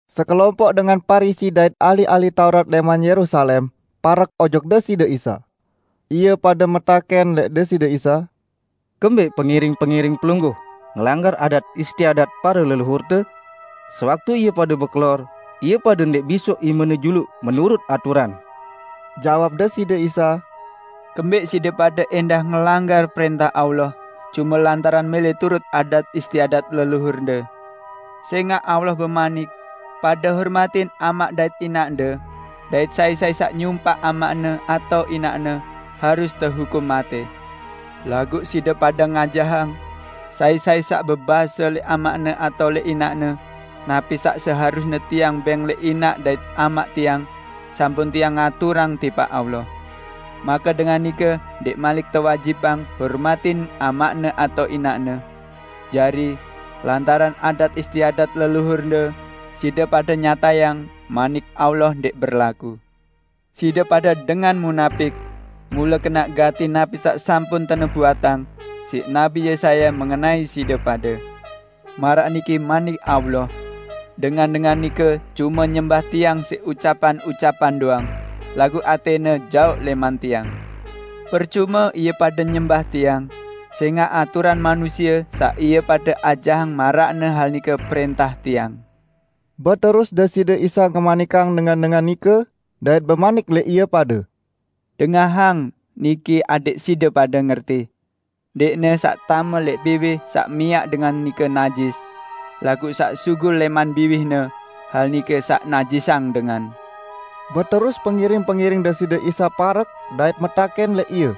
Sekelompoq dengan Parisi dait ahli-ahli Taurat lẽman Yerusalem parek ojok Deside Isa. Ie pade metakẽn lẽq Deside Isa, "Kembẽq pengiring-pengiring Pelungguh ngelanggar adat istiadat pare leluhurte? Sewaktu ie pade bekelor, ie pade ndẽq bisoq imene juluq menurut aturan!" Jawab Deside Isa, "Kembẽq side pade ẽndah ngelanggar prẽntah Allah cume lantaran mẽlẽ turut adat istiadat leluhurde? Sẽngaq Allah bemanik, 'Pade hormatin amaq dait inaqde,' dait 'Sai-sai saq nyumpaq amaqne atao inaqne harus tehukum matẽ.' Laguq side pade ngajahang: Sai-sai saq bebase lẽq amaqne atao lẽq inaqne, 'Napi saq seharusne tiang bẽng lẽq inaq dait amaq tiang, sampun tiang ngaturang tipaq Allah,' make dengan nike ndẽq malik tewajibang hormatin amaqne atao inaqne. Jari, lantaran adat istiadat leluhurde, side pade nyatayang Manik Allah ndẽq berlaku. Side pade dengan munapik! Mule kenaq gati napi saq sampun tenubuatang siq Nabi Yesaya mengenai side pade, 'Maraq niki manik Allah: Dengan-dengan nike cume nyembah Tiang siq ucapan-ucapan doang, laguq atẽne jaoq lẽman Tiang. Percume ie pade nyembah Tiang, sẽngaq aturan manusie saq ie pade ajahang maraqne hal nike prẽntah Tiang.' " Beterus Deside Isa ngemanikang dengan-dengan nike, dait bemanik lẽq ie pade, "Dengahang niki adẽq side pade ngerti! Ndẽqne saq tame lẽq biwih saq miaq dengan nike najis; laguq saq sugul lẽman biwihne, hal nike saq najisang dengan." Beterus pengiring-pengiring Deside Isa parek dait metakẽn lẽq Ie,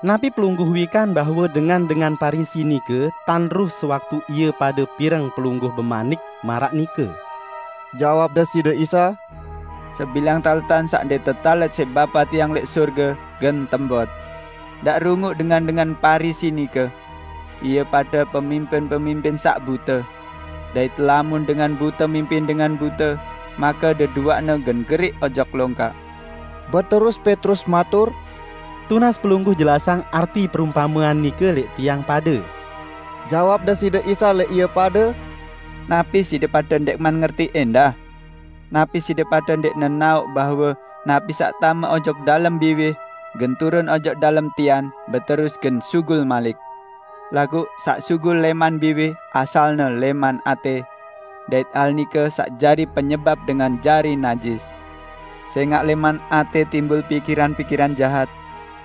"Napi Pelungguh wikan bahwe dengan-dengan Parisi nike tandruh sewaktu ie pade pireng Pelungguh bemanik maraq nike?" Jawab Deside Isa, "Sebilang taletan saq ndẽq tetalet siq Bapa Tiang lẽq sorge gen tembot. Ndaq runguq dengan-dengan Parisi nike. Ie pade pemimpin-pemimpin saq bute; dait lamun dengan bute mimpin dengan bute, make deduaqne gen geriq ojok longkak." Beterus Petrus matur, "Tunas Pelungguh jelasang arti perumpamean nike lẽq tiang pade!" Jawab Deside Isa lẽq ie pade, "Napi side pade ndẽqman ngerti ẽndah? Napi side pade ndẽq nenaoq bahwe napi saq tame ojok dalem biwih gen turun ojok dalem tian beterus gen sugul malik? Laguq saq sugul lẽman biwih asalne lẽman atẽ; dait hal nike saq jari penyebap dengan jari najis. Sẽngaq lẽman atẽ timbul pikiran-pikiran jahat,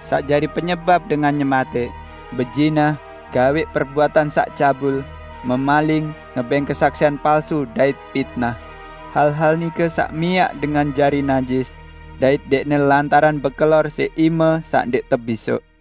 saq miaq dengan nyematẽq, bezinah, gawẽq perbuatan saq cabul, memaling, ngebẽng kesaksian palsu dait pitnah. Hal-hal nike saq miaq dengan jari najis, dait ndẽqne lantaran bekelor siq ime saq ndẽq tebisoq."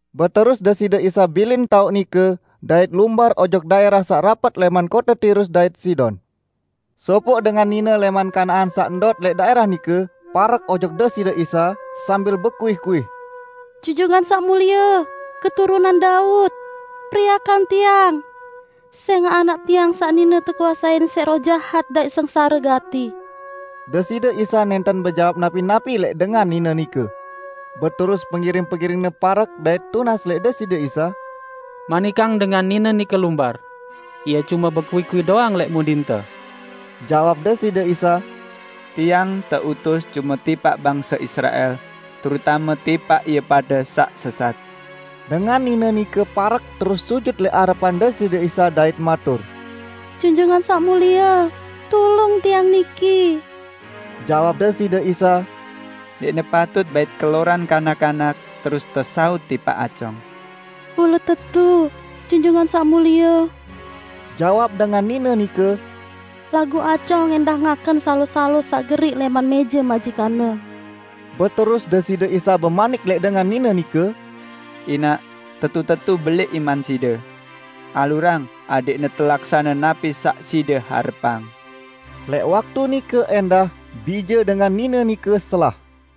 Beterus Deside Isa bilin taoq nike dait lumbar ojok daẽrah saq rapet lẽman kote Tirus dait Sidon. Sopoq dengan nine lẽman Kanaan saq ndot lẽq daẽrah nike parek ojok Deside Isa, sambil bekuih-kuih, "Junjungan Saq Mulie, Keturunan Daud, periakang tiang, sẽngaq anak tiang saq nine tekuasein siq roh jahat dait sengsare gati." Deside Isa nẽnten bejawab napi-napi lẽq dengan nine nike. Beterus pengiring-pengiring-Ne parek dait tunas lẽq Deside Isa, "Manikang dengan nine nike lumbar. Ie cume bekuih-kuih doang lẽq mudinte." Jawab Deside Isa, "Tiang teutus cume tipaq bangse Israel, terutame tipaq ie pade saq sesat." Dengan nine nike parek terus sujut lẽq arepan Deside Isa dait matur, "Junjungan Saq Mulie, tulung tiang niki." Jawab Deside Isa, "Ndẽqne patut bait keloran kanak-kanak terus tesaut tipaq acong." "Mule tetu, Junjungan Saq Mulie," jawab dengan nine nike, "laguq acong ẽndah ngaken salo-salo saq geriq lẽman mẽje majikanne." Beterus Deside Isa bemanik lẽq dengan nine nike, "Inaq, tetu-tetu belẽq iman side! Alurang adẽqne telaksane napi saq side harepang!" Lẽq waktu nike ẽndah, bije dengan nine nike selah.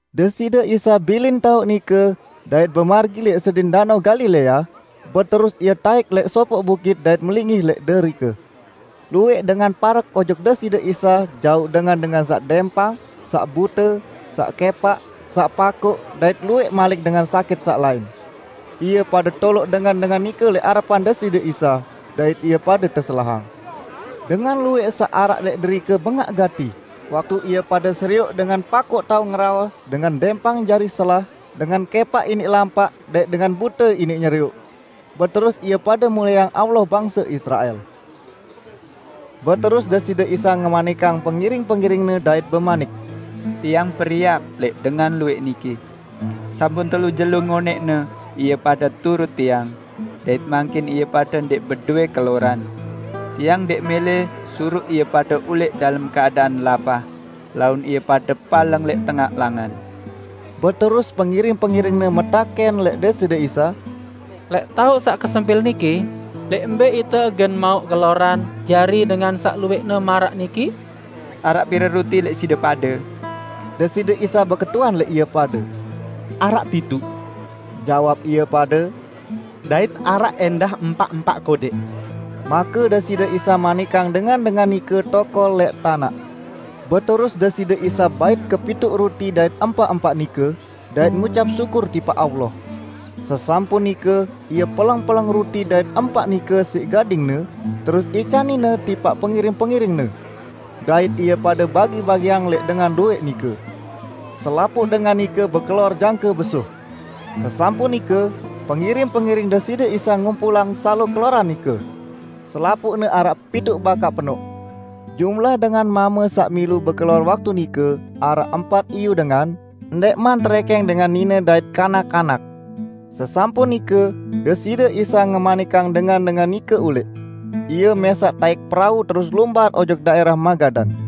Deside Isa bilin taoq nike, dait bemargi lẽq sedin Danao Galilea, beterus Ie taẽk lẽq sopoq bukit dait melinggih lẽq derike. Luwẽq dengan parek ojok Deside Isa jauq dengan-dengan saq dẽmpang, saq bute, saq kẽpaq, saq pakoq dait luwẽq malik dengan sakit saq lain. Ie pade toloq dengan-dengan nike lẽq arepan Deside Isa, dait ie pade teselahang. Dengan luwẽq saq araq lẽq derike bengaq gati, waktu ie pade serioq dengan pakoq tao ngeraos, dengan dẽmpang jari selah, dengan kẽpaq iniq lampaq dait dengan bute iniq nyerioq. Beterus ie pade mulieang Allah bangse Israel. Beterus Deside Isa ngemanikang pengiring-pengiring-Ne dait bemanik, "Tiang periak lẽq dengan luwẽq niki. Sampun telu jelo ngonẽqne ie pade turut Tiang, dait mangkin ie pade ndẽq bedowẽ keloran. Tiang ndẽq mẽlẽ suruq ie pade ulẽq dalem keadaan lapah, laun ie pade paleng lẽq tengaq langan." Beterus pengiring-pengiring-Ne metakẽn lẽq Deside Isa, "Lẽq taoq saq kesempil niki lẽq mbẽ ite gen mauq keloran jari dengan saq luwẽqne maraq niki?" "Araq pire ruti lẽq side pade?" Deside Isa beketuan lẽq ie pade. "Araq pituq," jawab ie pade, "dait araq ẽndah empaq-empaq kodẽq." Make Deside Isa manikang dengan-dengan nike tokol lẽq tanaq. Beterus Deside Isa bait kepituq ruti dait empaq-empaq nike, dait ngucap syukur tipaq Allah. Sesampun nike Ie peleng-peleng ruti dait empaq nike siq gading-Ne, terus icanin-Ne tipaq pengiring-pengiring-Ne. Dait ie pade bagi-bagiang lẽq dengan luwẽq nike. Selapuq dengan nike bekelor jangke besuh. Sesampun nike, pengiring-pengiring Deside Isa ngumpulang salo keloran nike. Selapuqne araq pituq bakaq penoq. Jumlah dengan mame saq milu bekelor waktu nike araq empat iyu dengan, ndẽqman terẽkẽng dengan nine dait kanak-kanak. Sesampun nike, Deside Isa ngemanikang dengan-dengan nike ulẽq. Ie mẽsaq taẽk perau terus lumbar ojok daẽrah Magadan.